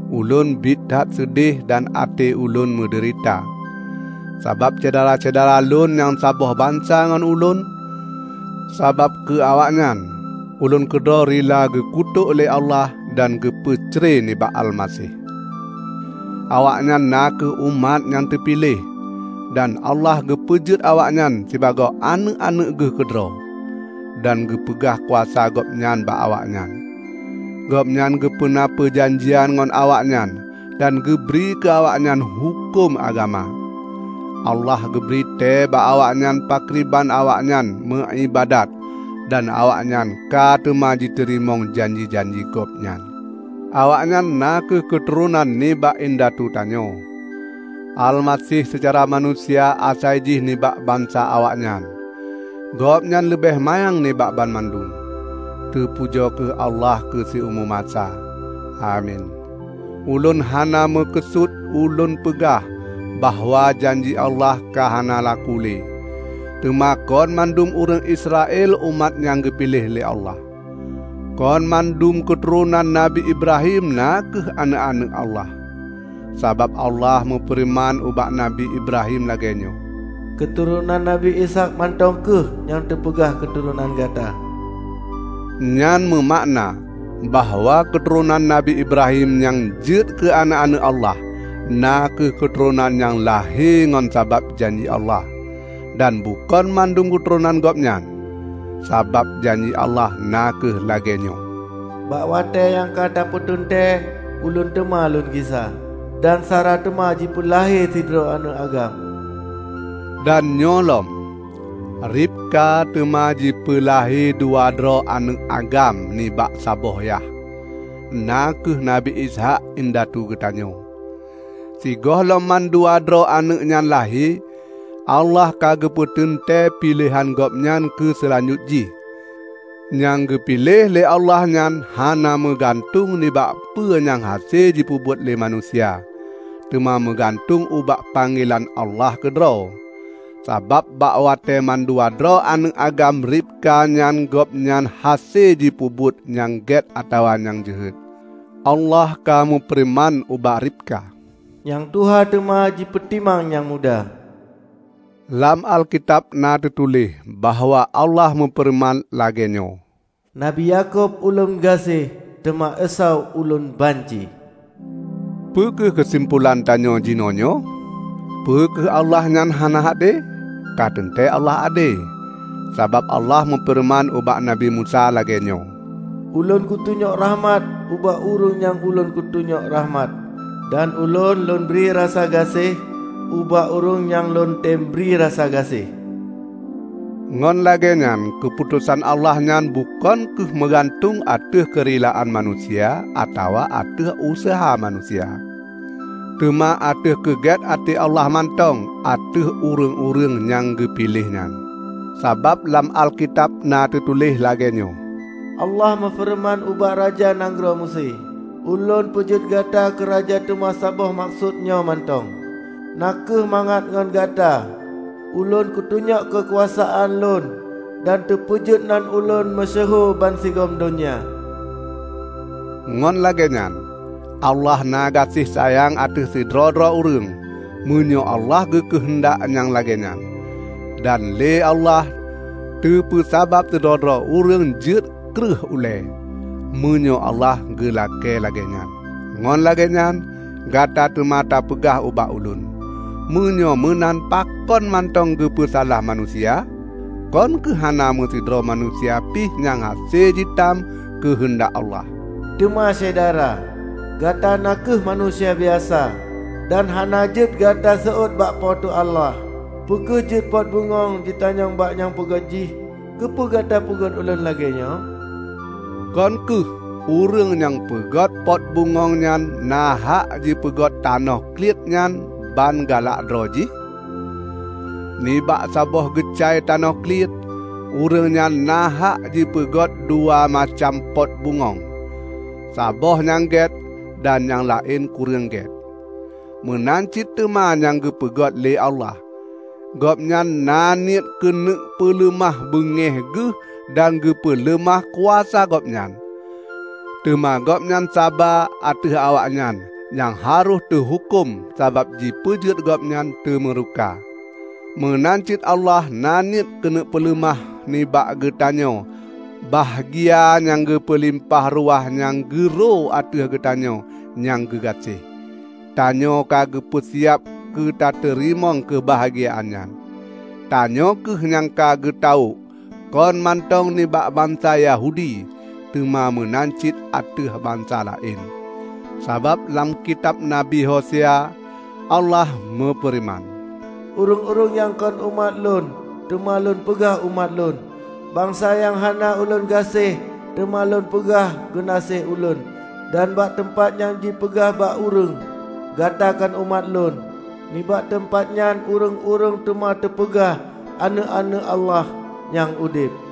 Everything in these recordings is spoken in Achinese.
Ulôn biet that seudeh dan até ulôn meudeurita sabab syedara-syedara lôn nyang saboh bansa ngon ulôn. Sabab keu awaknyan, ulôn keudroe rila geukutôk lé Allah dan geupeucre nibak Almaseh. Awaknyan na kheueh umat nyang teupiléh dan Allah geupeujeuet awaknyan sibagoe aneuëk-aneuëk geuh keudroe, dan geupeugah kuasa Gobnyan bak awaknyan. Gobnyan geupeuna peujanjian ngon awaknyan dan geubri keu awaknyan huköm agama. Allah geubri tée bak awaknyan pakriban awaknyan meu iébadat dan awaknyan ka teuma jiteurimong janji-janji Gobnyan. Awaknyan na kheueh keuturonan nibak indatu tanyoe. Almaseh seucara manusia asai jih nibak bansa awaknyan. Gobnyan leubeh manyang nibak banmandum. Teupujoe kheueh Allah keu siumu masa! Amin. Ulôn hana meukeusut ulôn peugah bahwa janji Allah ka hana laku le; teuma kon mandum ureuëng Israel umat nyang geupiléh lé Allah. Kon banmandum keuturonan Nabi Ibrahim na kheueh aneuëk-aneuëk Allah. Sabab Allah meufeureuman ubak Nabi Ibrahim lagée nyoe, "Keuturonan Nabi Ishaq mantong kheueh nyang teupeugah keuturonan gata." Nyan meumakna bahwa keuturonan Nabi Ibrahim nyang jeuet keu aneuëk-aneuëk Allah, na kheueh keuturonan nyang lahé ngon sabab janji Allah; dan bukon mandum keuturonan gobnyan. Sabab janji Allah na kheueh lagée nyoe, "Bak watée nyang ka teupeuteuntée, Ulôn teuma Lôn gisa, dan Sara teuma jipeulahé sidroe aneuëk agam." Dan nyoe lom: Ribka teuma jipeulahé dua droe aneuëk agam nibak saboh yah, na kheueh Nabi Ishaq indatu geutanyoe. Sigohlom mandua droe aneuëk nyan lahé, Allah ka geupeuteuntée piléhan Gobnyan keu seulanjut jih. Nyang geupiléh lé Allah nyan hana meugantueng nibak peue nyang hase jipeubuet lé manusia, teuma meugantueng ubak panggelan Allah keudroe. Sabab bak watée mandua droe aneuëk agam Ribka nyan gohlom hase jipeubuet nyang gét atawa nyang jeuhet, Allah ka meufeureuman ubak Ribka, "Nyang tuha teuma jipeutimang nyang muda." Lam Alkitab na teutuléh bahwa Allah meufeureuman lagée nyoe, "Nabi Yakub Ulôn gaséh, teuma Esau Ulôn banci." Peu kheueh keusimpolan tanyoe jinoenyoe? Peu kheueh Allah nyan hana ade? Ka teuntée Allah ade! Sabab Allah meufeureuman ubak Nabi Musa lagée nyoe, "Ulôn kutunyok rakhmat ubak ureuëng nyang Ulôn keuneuk tunyok rakhmat, dan Ulôn Lôn bri rasa gaséh ubak ureuëng nyang Lôn tem bri rasa gaséh." Ngon lagée nyan keuputosan Allah nyan bukon kheueh meugantueng ateueh keurilaan manusia atawa ateueh useuha manusia, teuma ateueh keugét até Allah mantong ateueh ureuëng-ureuëng nyang geupiléh nyan. Sabab lam Alkitab na teutuléh lagée nyoe, "Allah meufeureuman ubak Raja Nanggroe Meusé, 'Ulôn peujeuet gata keuraja teuma saboh meukeusut nyoe mantong, na kheueh mangat ngon gata, Ulôn kutunyok keukuasaan Lôn dan teupeujeuet nan Ulôn meusyeuhu bansigom donya.' " Ngon lagée nyan, Allah na gaséh sayang ateueh sidroe-droe ureuëng, meunyoe Allah geukeuheundak nyang lagée nyan. Dan lé Allah teupeusabab sidroe-droe ureuëng jeuet kreueh ulée, meunyoe Allah geulakée lagée nyan. Ngon lagée nyan, Gata teuma tapeugah ubak ulôn, "Meunyoe meunan pakon mantong geupeusalah manusia? Kon kheueh hana meusidroe manusia pih nyang hase jitam keuheundak Allah?" Teuma Syedara! Gata na kheueh manusia biasa. Dan hana jeuet Gata seuôt bak Po teu Allah! Peu kheueh jeuet pot bungöng jitanyong bak nyang peugét jih, "Keupeue gata peugét ulôn lagée nyoe?" Kon kheueh ureuëng nyang peugét pot bungöng nyan na hak jipeugét tanoh kliet nyan ban galak droe jih? Nibak saboh geucai tanoh kliet, ureuëng nyan na hak jipeugét dua macam pot bungöng: saboh nyang gét, dan nyang laén kureueng gét. Meunan cit teuma nyang geupeugét lé Allah. Gobnyan na niet keuneuk peuleumah beungéh geuh dan geupeuleumah kuasa Gobnyan. Teuma Gobnyan saba ateueh awaknyan nyang harôh teuhuköm sabab jipeujeuet Gobnyan teumeureuka. Meunan cit Allah na niet keuneuk peuleumah nibak geutanyoe bahgia nyang meulimpah ruah nyang geuro ateueh geutanyoe nyang geugaséh. Tanyoe ka geupeu siab keutateurimong keubahgiaan nyan. Tanyoe kheueh nyang ka geutawök, kon mantong nibak bansa Yahudi, teuma meunan cit ateueh bansa laén. Sabab lam kitab Nabi Hosea, Allah meufeureuman, "Ureuëng-ureuëng nyang kon umat Lôn, teuma Lôn peugah 'Umat Lôn', Bansa nyang hana Ulôn gaséh, teuma Lôn peugah 'Geunaséh Ulôn', Dan bak teumpat nyang jipeugah bak ureuëng, 'Gata kon umat Lôn,' nibak teumpat nyan ureuëng-ureuëng teuma teupeugah aneuëk-aneuëk Allah nyang udeb."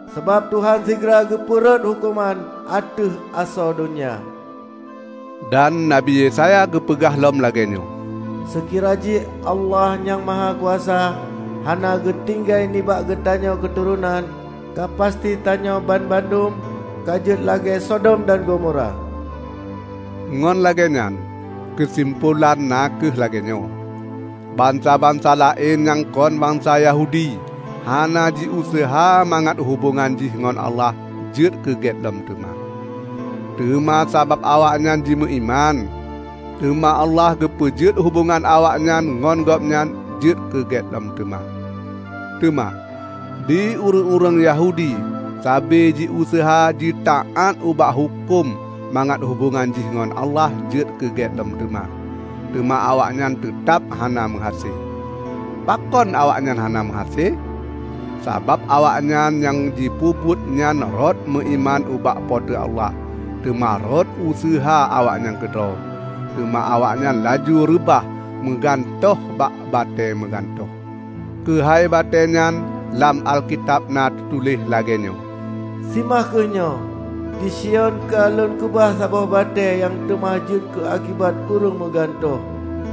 sabab Tuhan sigra geupeu rhot huköman ateueh asoe donya." Dan Nabi Yesaya geupeugah lom lagée nyoe, "Seukira jih Allah Nyang Mahakuasa hana geutinggai nibak geutanyoe keuturonan, ka pasti tanyoe banmandum ka jeuet lagée Sodom dan Gomora." Ngon lagée nyan, keusimpolan na kheueh lagée nyoe: Bansa-bansa laén nyang kon bansa Yahudi hana jiuseuha mangat hubongan jih ngon Allah jeuet keugét lom teuma. Teuma sabab awaknyan jimeuiman, teuma Allah geupeujeuet hubongan awaknyan ngon Gobnyan jeuet keugét lom teuma. Teuma, di ureuëng-ureuëng Yahudi sabe jiuseuha jitaát ubak huköm mangat hubongan jih ngon Allah jeuet keugét lom. Teuma awaknyan teutab hana meuhase. Pakon awaknyan hana meuhase? Sabab awaknyan nyang jipeubuet nyan rot meuiman ubak Po teu Allah, teuma rot useuha awaknyan keudroe. Teuma awaknyan laju reubah meugantoh bak "Batée meugantoh". Keuhai batéenyan lam Alkitab na teutuléh lagée nyoe, "Simah kheueh nyoe: Di Sion ka Lôn keubah saboh batée nyang teuma jeuet keuakibat ureuëng meugantoh;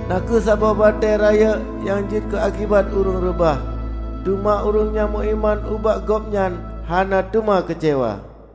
na kheueh saboh batée rayeuk nyang jeuet keuakibat ureuëng reubah. Teuma ureuëng nyang meuiman ubak Gobnyan hana teuma keucewa."